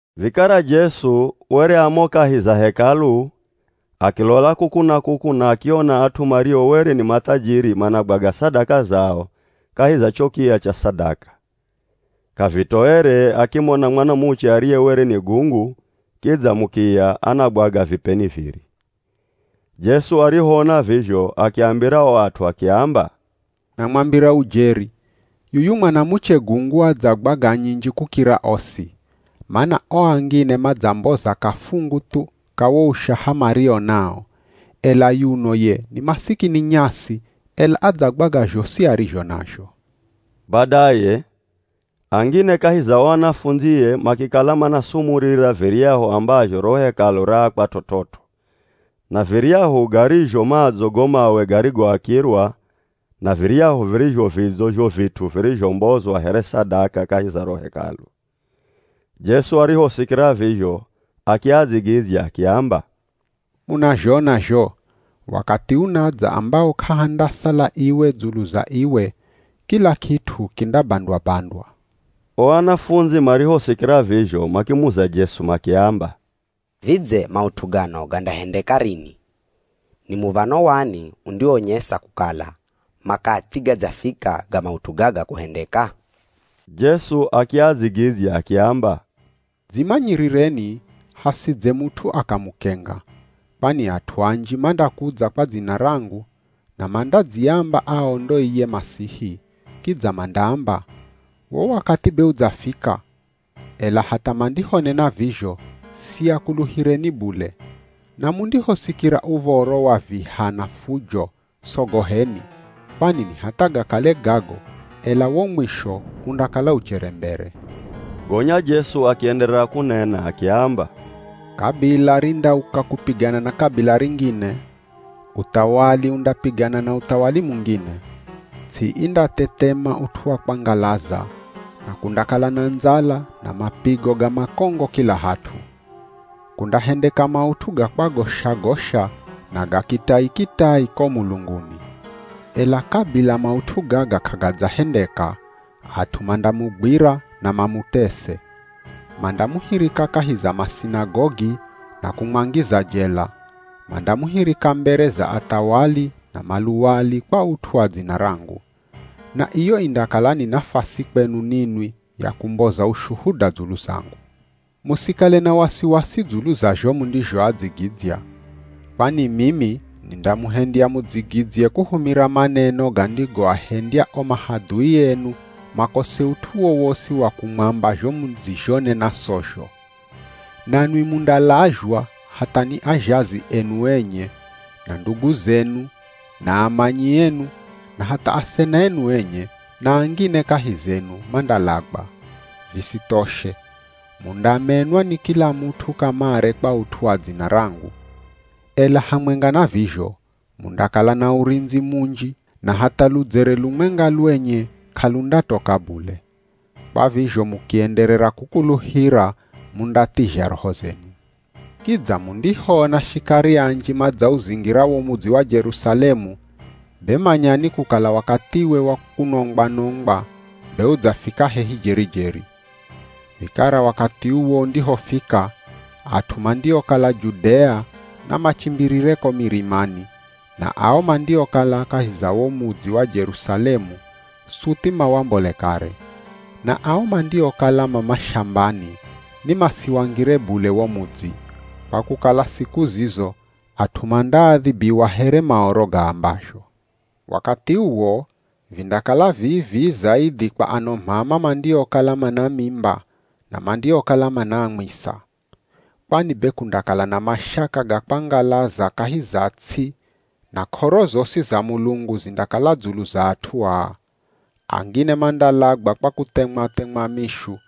Vikara Jesu were a mo kahi za Hekalu akilola kuku na kuku na akiona at'u mario were ni mathajiri managwaga sadaka zao kahi za cho kiya cha sadaka. K'avitoere akimona mwanamuche ariye were ni gungu kidza mukiya anagwaga vipeni viri. Jesu arihoona vizho akiambira o at'u akiamba, “Namwambira ujeri, yuyu mwanamuche gungu adzagwaga nyinji kukira osi, mana o angine madzamboza kafungu thu ka wo ushaha mario nao, ela yuno ye ni masikini nyasi, ela adzagwaga zhosi arizho nazho.” Badaye angine kahi za o anafundzie makikala manasumurira viryahu ambazho ro Hekalu raakwa t'ot'ot'o na viryahu garizho madzo go mawe garigoakirwa na viryahu virizho vidzo zho vit'u virizhombozwa here sadaka kahi za ro Hekalu. Jesu arihosikira vizho akiadzigidzya akiamba, “Munazhona zho, wakathi unadza ambawo k'ahandasala iwe dzulu za iwe, kila kit'u kindabandwa-bandwa.” O anafundzi marihosikira vizho makimuza Jesu makiamba, “Vidze maut'u gano gandahendeka rini? Ni muv̱ano wani undiwonyesa kukala makathi gadzafika ga maut'u gaga kuhendeka?” Jesu akiadzigidzya akiamba, “Dzimanyirireni hasidze mut'u akamukenga. Kwani at'u anji mandakudza kwa dzina rangu, na mandadziamba ao ndo iye Masihi, kidza mandaamba, ‘Wo wakathi be udzafika.’ Ela hatha mandihonena vizho, siakuluhireni bule. Na mundihosikira uv̱oro wa viha na fujo, sogoheni, kwani ni hatha gakale gago, ela wo mwisho undakala uchere mbere.” Gonya Jesu akienderera kunena akiamba, “Kabila rindauka kupigana na kabila ringine. Uthawali undapigana na uthawali mungine. Ts'i indathethema ut'u wa kwangalaza, na kundakala na ndzala na mapigo ga makongo kila hat'u. Kundahendeka maut'u ga kwagosha-gosha na ga kitai-kitai ko mulunguni. Ela kabila maut'u gaga k'agadzahendeka, at'u mandamugwira na mamutese. Mandamuhirika kahi za masinagogi na kumwangiza jela. Mandamuhirika mbere za athawali na maluwali kwa ut'u wa dzina rangu. Na iyo indakala ni nafasi kwenu ninwi ya kumboza ushuhuda dzulu zangu. Musikale na wasiwasi dzulu za zho mundizhoadzigidzya. Kwani mimi nindamuhendya mudzigidzye kuhumira maneno gandigoahendya o mahadhui enu makose ut'u wowosi wa kumwamba zho mudzizhonena sozho. Nanwi mundalazhwa hatha ni azhazi enu enye, na ndugu zenu na amanyi enu na hatha asena enu enye, na angine kahi zenu mandalagwa. Visithoshe, mundamenwa ni kila mut'u kamare kwa ut'u wa dzina rangu. Ela hamwenga na vizho, mundakala na urindzi munji na hatha ludzere lumwenga lwenye k'alundatoka bule. Kwa vizho mukienderera kukuluhira mundathizha roho zenu.” “Kidza mundihoona shikari anji madzauzingira wo mudzi wa Jerusalemu, be manyani kukala wakathiwe wa kunongwa-nongwa be udzafika hehi jeri-jeri. Vikara wakathi uwo undihofika, at'u mandiokala Judea namachimbirire ko mirimani, na ao mandiokala kahi za wo mudzi wa Jerusalemu suthi mawambole kare. Na ao mandiokala ma mashambani ni masiwangire bule wo mudzi, kwa kukala siku zizo at'u mandaadhibiwa here Maoro gaambazho. Wakathi uwo vindakala vii-vii zaidhi kwa ano m'ama mandiokala mana mimba na mandiokala manaamwisa. Kwani be kundakala na mashaka ga kwangalaza kahi za ts'i na k'oro zosi za Mulungu zindakala dzulu za at'u aa. Angine mandalagwa kwa kuthemwa-themwa mishu,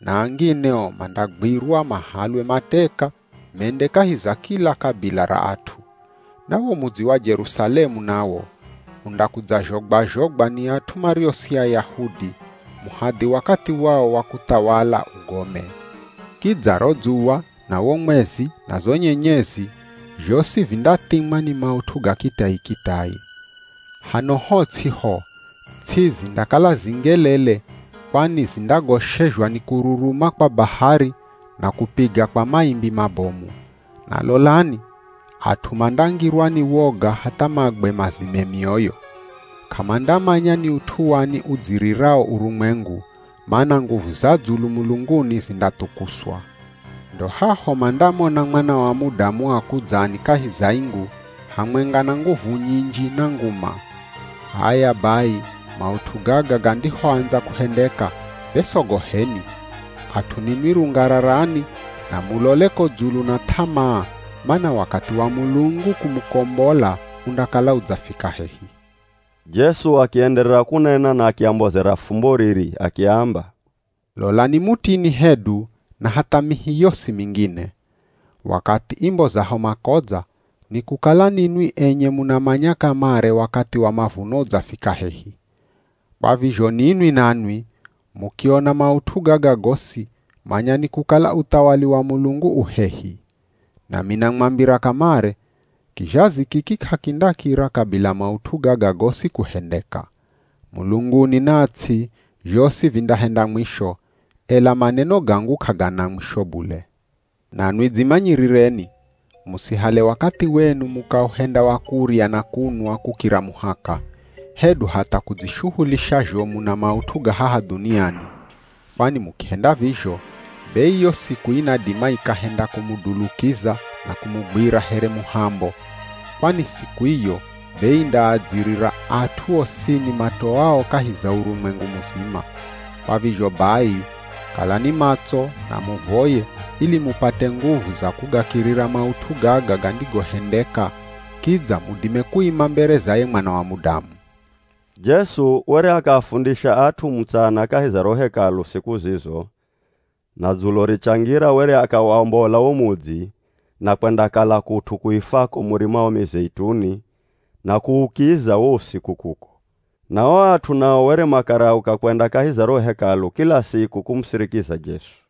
na angine o mandagwirwa mahalwe mateka mende kahi za kila kabila ra at'u. Na wo mudzi wa Jerusalemu nawo, undakudzazhogwa-zhogwa ni at'u mario si Ayahudi, muhadhi wakathi wao wa kuthawala ugome. “Kidza ro dzuwa na wo mwezi na zo nyenyezi, zhosi vindathimwa ni maut'u ga kitai-kitai. Hano ho ts'i ho, ts'i zindakala zingelele kwani zindagoshezhwa ni kururuma kwa bahari na kupiga kwa maimbi mabomu. Na lolani, at'u mandangirwa ni woga hatha magwe mazime mioyo. K'amandamanya ni ut'u wani udzirirao urumwengu, mana nguvu za dzulu mulunguni zindathukuswa. Ndo haho mandamona Mwana wa Mudamu akudzani kahi za ingu, hamwenga na nguvu nyinji na nguma. H'aya bai maut'u gaga gandihoandza kuhendeka, be sogoheni, at'u ninwi rungararani na mulole ko dzulu na th'amaa mana wakathi wa Mulungu kumukombola undakala udzafika hehi!” Jesu akienderera kunena na akiambozera fumbo riri. Akiamba, “Lolani mutini hedu na hatha mihi yosi mingine. Wakathi imbozaho makodza, ni kukala ninwi enye munamanya kamare wakathi wa mavuno udzafika hehi. Kwa vizho ninwi nanwi, mukiona maut'u gaga gosi, manyani kukala uthawali wa Mulungu u hehi. “Nami namwambira kamare, kizhazi kiki k'akindakira kabila maut'u gaga gosi kuhendeka. Mulunguni na ts'i, zhosi vindahenda mwisho, ela maneno gangu k'agana mwisho bule.” “Nanwi dzimanyirireni, musihale wakathi wenu mukauhenda wa kurya na kunwa kukira muhaka, hedu hatha kudzishuhulisha zhomu na maut'u ga haha dhuniani, kwani mukihenda vizho, be iyo siku inadima ikahenda kumudulukiza na kumugwira here muhambo. Kwani siku iyo be indaadzirira at'u osini matoao kahi za urumwengu muzima. Kwa vizho bai kalani matso na muvoye ili mupate nguvu za kugakirira maut'u gaga gandihohendeka, kidza mudime kuima mbere za ye Mwana wa Mudamu.” Jesu were akaafundisha at'u mutsana kahi za ro Hekalu siku zizo, na dzulo richangira were akawombola wo mudzi na kwendakala kut'u kuifwako Murima wa Mizeituni na kuukiza wo usiku kuko. Na o at'u nao were makarauka kwenda kahi za ro Hekalu kila siku kumusirikiza Jesu.